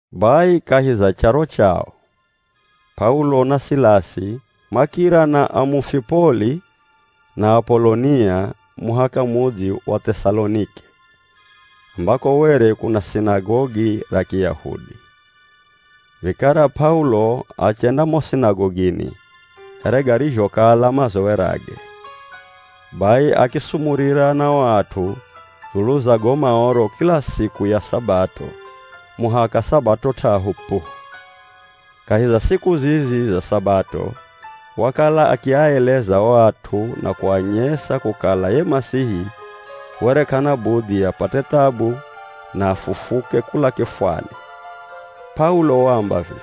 Bai kahi za charo chao, P'aulo na Silasi makira na Amufipoli na Apolonia muhaka mudzi wa Th'esalonike ambako were kuna sinagogi ra Kiyahudi. Vikara P'aulo achenda mo sinagogini here garizhokala mazowerage. Bai akisumurira na o at'u dzulu za go Maoro kila siku ya Sabato muhaka Sabato t'ahu pu. Kahi za siku zizi za Sabato wakala akiaeleza o at'u na kuanyesa kukala ye Masihi were k'ana budhi apate thabu na afufuke kula kifwani. P'aulo waamba vivi,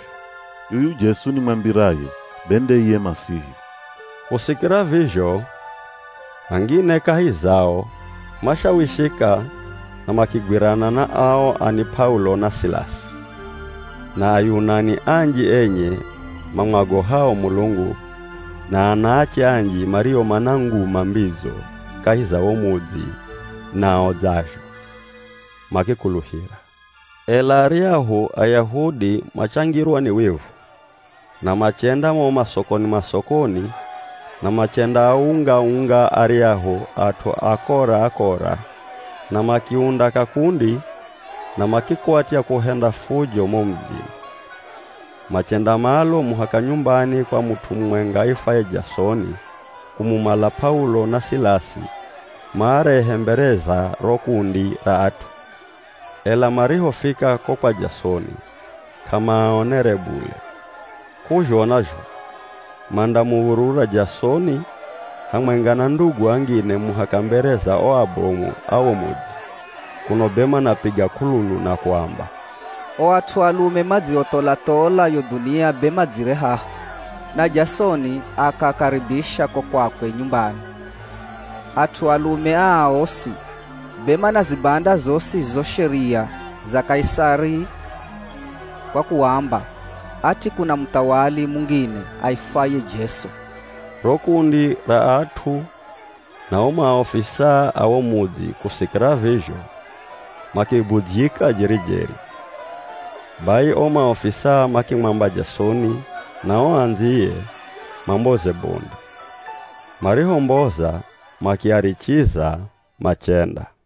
“Yuyu Jesu nimwambiraye, be nde iye Masihi.” Kusikira vizho, angine kahi zao mashawishika na makigwirana na ao ani P'aulo na Silasi, na Ayunani anji enye mamwagohao Mulungu na anaache anji mario mana nguma mbidzo kahi za wo mudzi nao dzazho, makikuluhira. Ela aryahu Ayahudi machangirwa ni wivu, na machenda mo masokoni-masokoni na machendaaunga-unga aryahu at'u akora-akora na makiunda kakundi, na makikwatya kuhenda fujo mo mudzini. Machenda malo muhaka nyumbani kwa mut'u mumwenga aifwaye Jasoni kumumala P'aulo na Silasi maarehe mbere za ro kundi ra at'u. Ela marihofika ko kwa Jasoni k'amaaonere bule, k'uzhona zho mandamuv̱urura Jasoni hamwenga na ndugu angine muhaka mbere za o abomu a wo mudzi, kuno be manapiga k'ululu na kuamba, “O at'u alume madziotholathola yo dhunia be madzire haha, na Jasoni akaakaribisha ko kwakwe nyumbani. At'u alume aa osi, be manazibanda zosi zo sheria za Kaisari kwa kuamba ati kuna muthawali mungine aifwaye Jesu.” Ro kundi ra at'u na o maofisaa a wo mudzi kusikira vizho, makibudzyika jeri-jeri. Bai o maofisaa makimwamba Jasoni na o andziye mamboze bondi, marihomboza, makiarichiza machenda.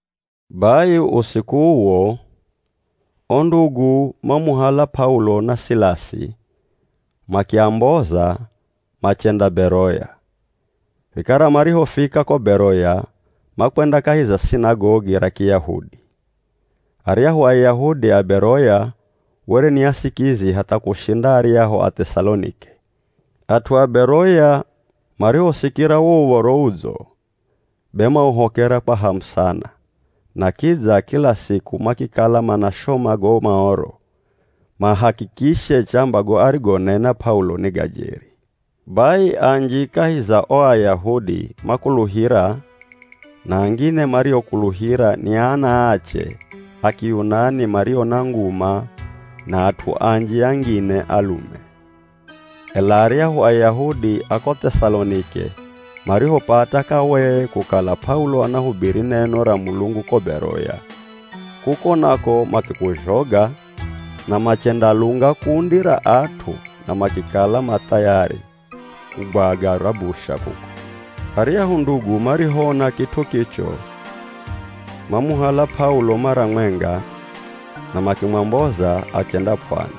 Bai usiku uwo, o ndugu mamuhala P'aulo na Silasi, makiamboza machenda Beroya. Vikara marihofika ko Beroya makwenda kahi za sinagogi ra Kiyahudi. Aryahu Ayahudi a Beroya were ni asikizi hatha kushinda aryahu a Th'esalonike. At'u a Beroya marihosikira wo Uv̱oro Udzo, be mauhokera kwa hamu sana na kidza kila siku makikala manashoma go Maoro mahakikishe chamba go arigonena P'aulo ni ga jeri. Bai anji kahi za o Ayahudi makuluhira na angine mariokuluhira ni anaache a Kiyunani mario na nguma na at'u anji angine alume. Ela aryahu Ayahudi a ko Th'esalonike marihopata kawee kukala P'aulo anahubiri neno ra Mulungu ko Beroya, kuko nako makikuzhoga na machendalunga kundi ra at'u na makikala ma thayari kugwaga rabusha kuko. Aryahu ndugu marihoona kit'u kicho, mamuhala P'aulo mara mwenga na makimwamboza achenda p'wani,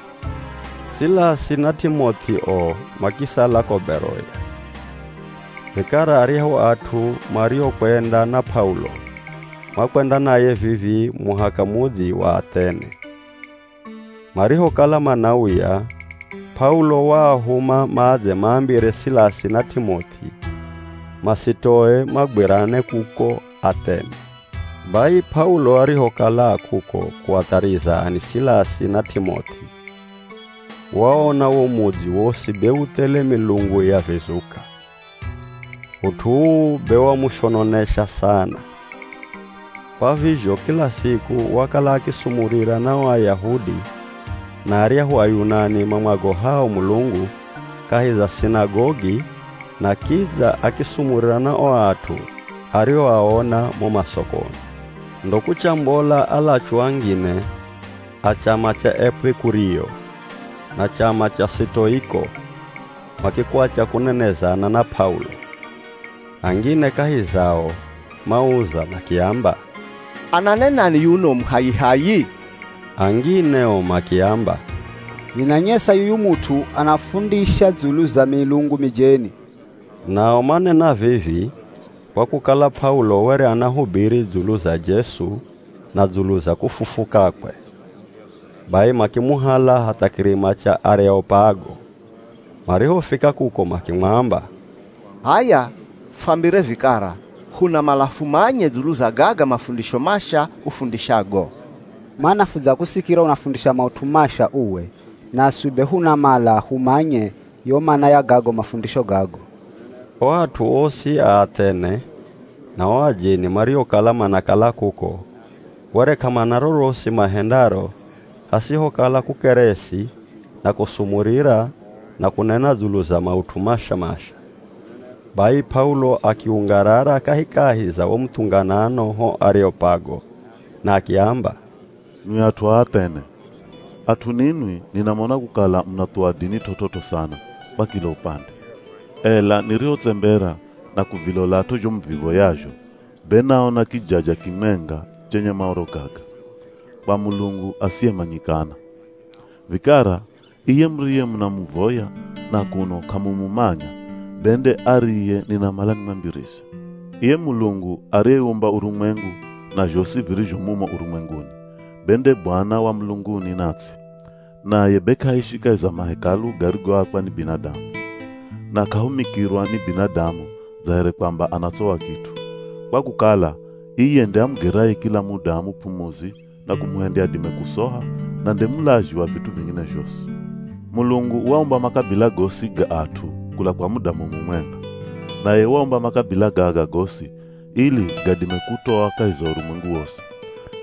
Silasi na T'imoth'i o makisala ko Beroya. Vikara aryahu at'u mariokwenda na P'aulo, makwenda naye vivii muhaka mudzi wa Athene. Marihokala manauya, P'aulo waahuma madze maambire Silasi na T'imoth'i, masitoe magwirane kuko Athene. Bai P'aulo arihokala a kuko kuathariza ani Silasi na T'imoth'i, waona wo mudzi wosi be u thele milungu ya vizuka, ut'u uu be wamushononesa sana. Kwa vizho kila siku wakala akisumurira na o Ayahudi na aryahu Ayunani mamwagohao Mulungu kahi za sinagogi na kidza akisumurira na o at'u arioaona mo masokoni. Ndo kuchambola alachu angine a chama cha Epikurio na chama cha Sitoiko, makikwatya kunenezana na P'aulo. Angine kahi zao mauza makiamba, “Ananenani yuno muhayihayi?” Angine o makiamba, “Vinanyesa yuyu mut'u anafundisha dzulu za milungu mijeni.” Nao manena vivi kwa kukala P'aulo were anahubiri dzulu za Jesu na dzulu za kufufukakwe. Bai makimuhala hatha kirima cha Areopago. Marihofika kuko makimwamba, “H'aya fwambire vikara, hunamala fumanye dzulu za gaga mafundisho masha ufundishago. Mana fudzakusikira unafundisha maut'u masha uwe, naswi be hunamala humanye yo mana ya gago mafundisho gago.” (O at'u osi a Athene na o ajeni mariokala manakala kuko were k'amana rorosi mahendaro hasihokala kukeresi na kusumurira na kunena dzulu za maut'u masha-masha.) Bai P'aulo akiungarara kahikahi za wo muthunganano ho Areopago na akiamba, “Nwi at'u a Athene! At'u ninwi ninamona kukala munathuwa dini t'ot'ot'o sana kwa kila upande. Ela nirihotsembera na kuvilolat'o zho muvivoyazho be naona kijaja kimwenga chenye maoro gaga: ‘KWA MULUNGU ASIYEMANYIKANA.’ Vikara iye muriyemunamuvoya na kuno k'amumumanya be nde ariye ninamala nimwambirize. Iye Mulungu ariyeumba urumwengu na zhosi virizho mumo urumwenguni, be nde Bwana wa mulunguni na ts'i, naye be k'aishi kahi za mahekalu garigoakwa ni binadamu. Na k'ahumikirwa ni binadamu dza here kwamba anatsowa kit'u, kwa kukala iye nde amugeraye kila mudamu p'umuzi na kumuhendya adime kusoha na nde mulazhi wa vit'u vingine zhosi. Mulungu waumba makabila gosi ga at'u kula kwa mudamu mumwenga, naye waumba makabila gaga gosi ili gadime kutoa kahi za urumwengu wosi.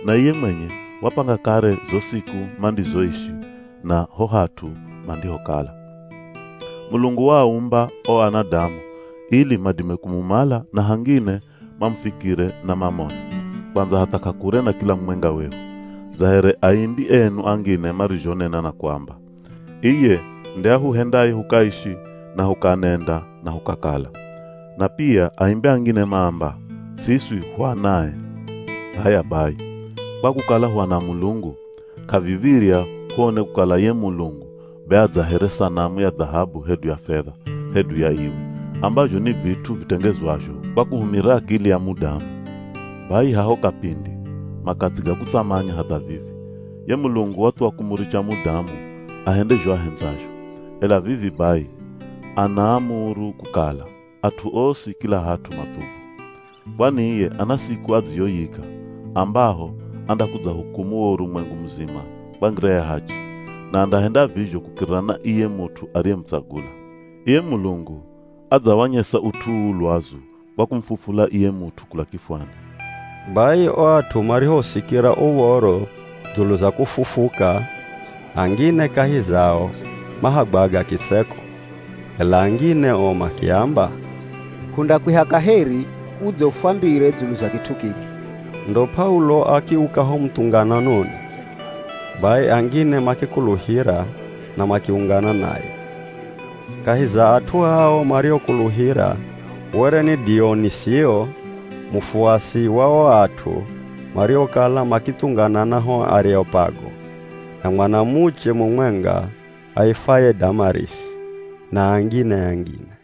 Na iye mwenye wapanga kare zo siku mandizoishi na ho hat'u mandihokala. Mulungu waaumba o anadamu ili madime kumumala na hangine mamufikire na mamone, kwandza hatha k'akure na kila mumwenga wehu. Dza here aimbi enu angine marizhonena na kuamba, ‘Iye, nde ahuhendaye hukaishi na hukanenda na hukakala.’ Na pia aimbi angine maamba, ‘Siswi hu anae.’ “H'aya bai, kwa kukala hu ana a Mulungu, k'aviv̱irya huone kukala ye Mulungu be a dza here sanamu ya dhahabu hedu ya fedha, hedu ya iwe, ambazho ni vit'u vitengezwazho kwa kuhumira akili ya mudamu. Bai haho kapindi makathi ga kutsamanya hatha vivi, ye Mulungu wathuwa kumuricha mudamu ahende zho ahendzazho, ela vivi bai anaamuru kukala at'u osi kila hat'u mathubu. Kwani iye ana siku adziyoyika ambaho andakudzahukumu wo urumwengu muzima kwa ngira ya hachi, na andahenda vizho kukirira na iye mut'u ariyemutsagula. Iye Mulungu adzawanyesa ut'u uu lwazu kwa kumufufula iye mut'u kula kifwani.” Bai o at'u marihosikira uv̱oro dzulu za kufufuka, angine kahi zao mahagwaga kitseko, ela angine o makiamba, “Hundakwiha kaheri udze ufwambire dzulu za kit'u kiki.” Ndo P'aulo akiuka ho muthungananoni. Bai angine makikuluhira na makiungana naye. Kahi za at'u ao mariokuluhira were ni Dionisio, mufuasi wa o at'u mariokala makithunganana ho Areopago, na mwanamuche mumwenga aifwaye Damarisi, na angine-angine.